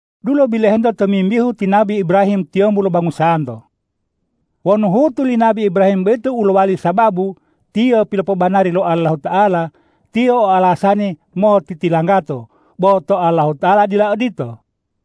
Dulo bilohento tomimbihu ti nabi Ibrahim tiyombu lo bangusanto. Wonu huhutu li nabi Ibrahim boyito u lowali sababu tiyo pilopobanari lo Allahuta'ala, tiyo o alasani motitilanggato, bo to Allahuta'ala dila odito.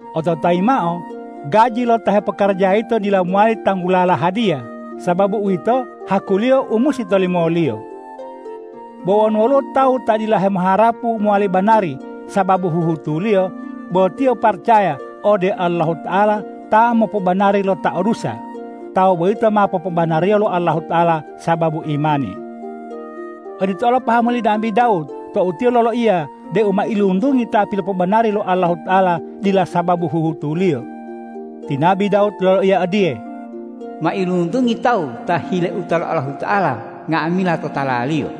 Ototayi mao, gaji lo ta hepokarajawa yito dila mowali tanggulala hadiya, sababu uwito hakuliyo u musi tolimoliyo. Bo wonu woluwo tawu ta dila hemoharapu mowali banari sababu huhutuliyo, bo tiyo paracaya ode Allahuta'ala ta mopobanari lo ta o dusa, tawu boyito ma popobanariyo lo Allahuta'ala sababu imani. Odito olo pahamu li nabi Dawud tou tiyo loloiya deu mailuntungi ta pilopobanari lo Allahuta'ala dila sababu huhutuliyo. Ti nabi Dawud loloiya odiye,”Mailuntungi tawu ta hileuta lo Allahuta'ala nga'amila totalaliyo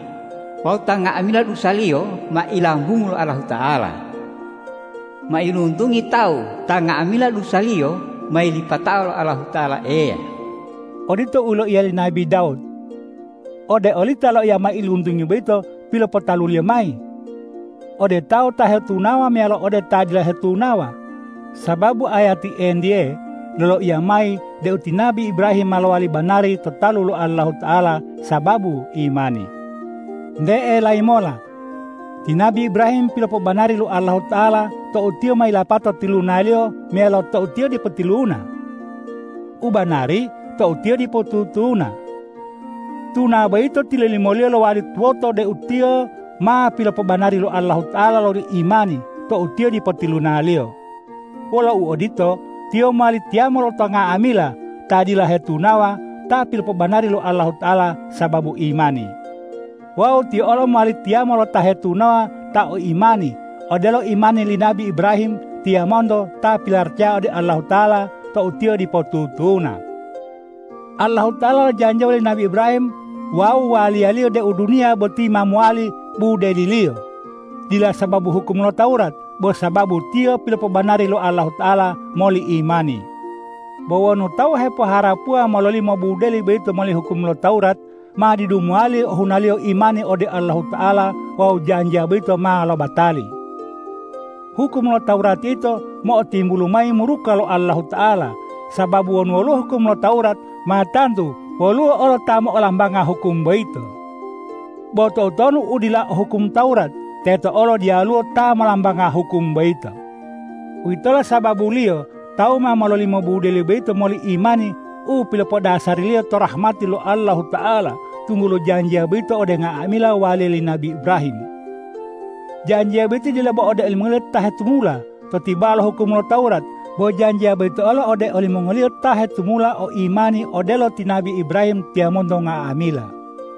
wawu ta nga'amila dusaliyo ma ilambungu lo Allahuta'ala! Mailuntungi tawu ta nga'amila dusaliyo ma yilipatao lo Allahuta'ala Eya!” Odito u yiloiya li nabi Dawud. Ode olita loiya mailuntungi boyito pilopotaluliyo mayi? Ode tawu ta hetunawa meyalo ode ta dila hetunawa? Sababu ayati entiye loloiya mayi deu ti nabi Ibrahim ma lowali banari to talu lo Allahuta'ala sababu imani. Nte elayi mola, ti nabi Ibrahim pilopobanari lo Allahuta'ala tou tiyo ma yilapato tilunaliyo meyalo tou tiyo dipo tiluna? U banari, tou tiyo dipo tutuna. Tuna boyito tilolimoliyo lowali tuwoto deu tiyo ma pilopobanari lo Allahuta'ala loli imani tou tiyo dipo tilunaliyo. Wolo uodito, tiyo mowali tiyamo lo nga'amila ta dila hetunawa ta pilopobanari lo Allahuta'ala sababu imani. Wawu tiyo olo mowali tiyamo lo ta hetunawa ta o imani odelo imani li nabi Ibrahim tiyamonto ta pilaracaya ode Allahuta'ala tou tiyo dipo tutuna. Allahuta'ala lojanjiya woli nabi Ibrahim wawu waliyaliyo deu duniya boti ma mowali budeliliyo, dila sababu hukum lo Tawurat, bo sababu tiyo pilopobanari lo Allahuta'ala moli imani. Bo wonu tawu hepoharapuwa mololimo budeli boyito moli hukum lo Tawurat, ma didu mowali ohunaliyo imani ode Allahuta'ala wawu janjiya boyito ma lobatali. Hukum lo Tawurat yito mo'otimbulu mayi muruka lo Allahuta'ala, sababu wonu woluwo hukum lo Tawurat, ma tantu woluwo olo ta molambanga hukum boyito. Bo toutonu u dila o hukum lo Tawurat, teto olo diyaluwo ta molambanga hukum boyito. Uwitolo sababuliyo tawu ma mololimo budeli boyito moli imani u pilopodasariliyo to rahmati lo Allahuta'ala, tunggulo janjiya boyito ode nga'amila waliya li nabi Ibrahim. Janjiya boyito dila bo ode olimongoliyo ta hetumula to tibawa lo hukum lo Tawurat, bo janjiya boyito olo ode olimongoliyo ta hetumula o imani odelo ti nabi Ibrahim tiyamonto nga'amila.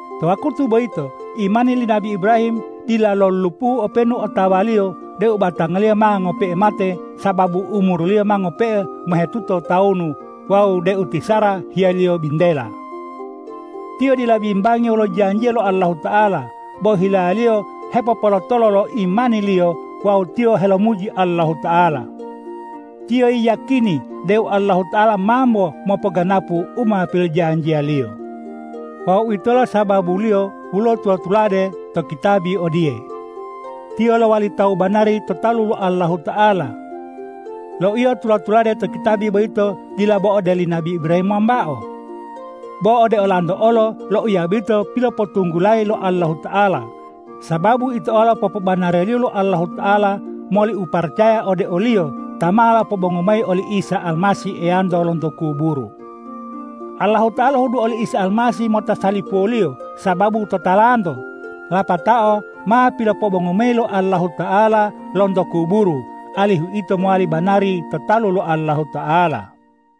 To wakutu boyito imani li nabi Ibrahim dila lolulupuhu openu otawaliyo deu batangaliyo ma ngope'e mate sababu umuriliyo ma ngope'e mohetuto tawunu wawu deu ti Sara hiyaliyo bintela. Tiyo dila bimbangi wolo janjiya lo Allahuta'ala, bo hilaliyo hepopolotolo lo imaniliyo wawu tiyo helomuji Allahuta'ala. Tiyo yiyakini deu Allahuta'ala mambo mopoganapu u ma pilojanjiya-Liyo. Wawu uwitolo sababuliyo woluwo tula-tulade to kitabi odiye,”Tiyo lowali tawu banari to talu lo Allahuta'ala.” Loiya u tula-tulade to kitabi boyito dila bo ode oli nabi Ibrahim wambao. Bo ode olanto olo loiya boyito pilopotunggulayi lo Allahuta'ala, sababu ito olo popobanariyo lo Allahuta'ala moli uparacaya ode o-Liyo ta ma lopobongu mayi oli Isa Almasih Eyanto lonto kuburu. Allahuta'ala lohudu oli Isa Almasih mota salipuwoliyo sababu totalanto, lapatao ma pilopobongu mayi lo Allahuta'ala lonto kuburu, alihu ito mowali banari to talu lo Allahuta'ala.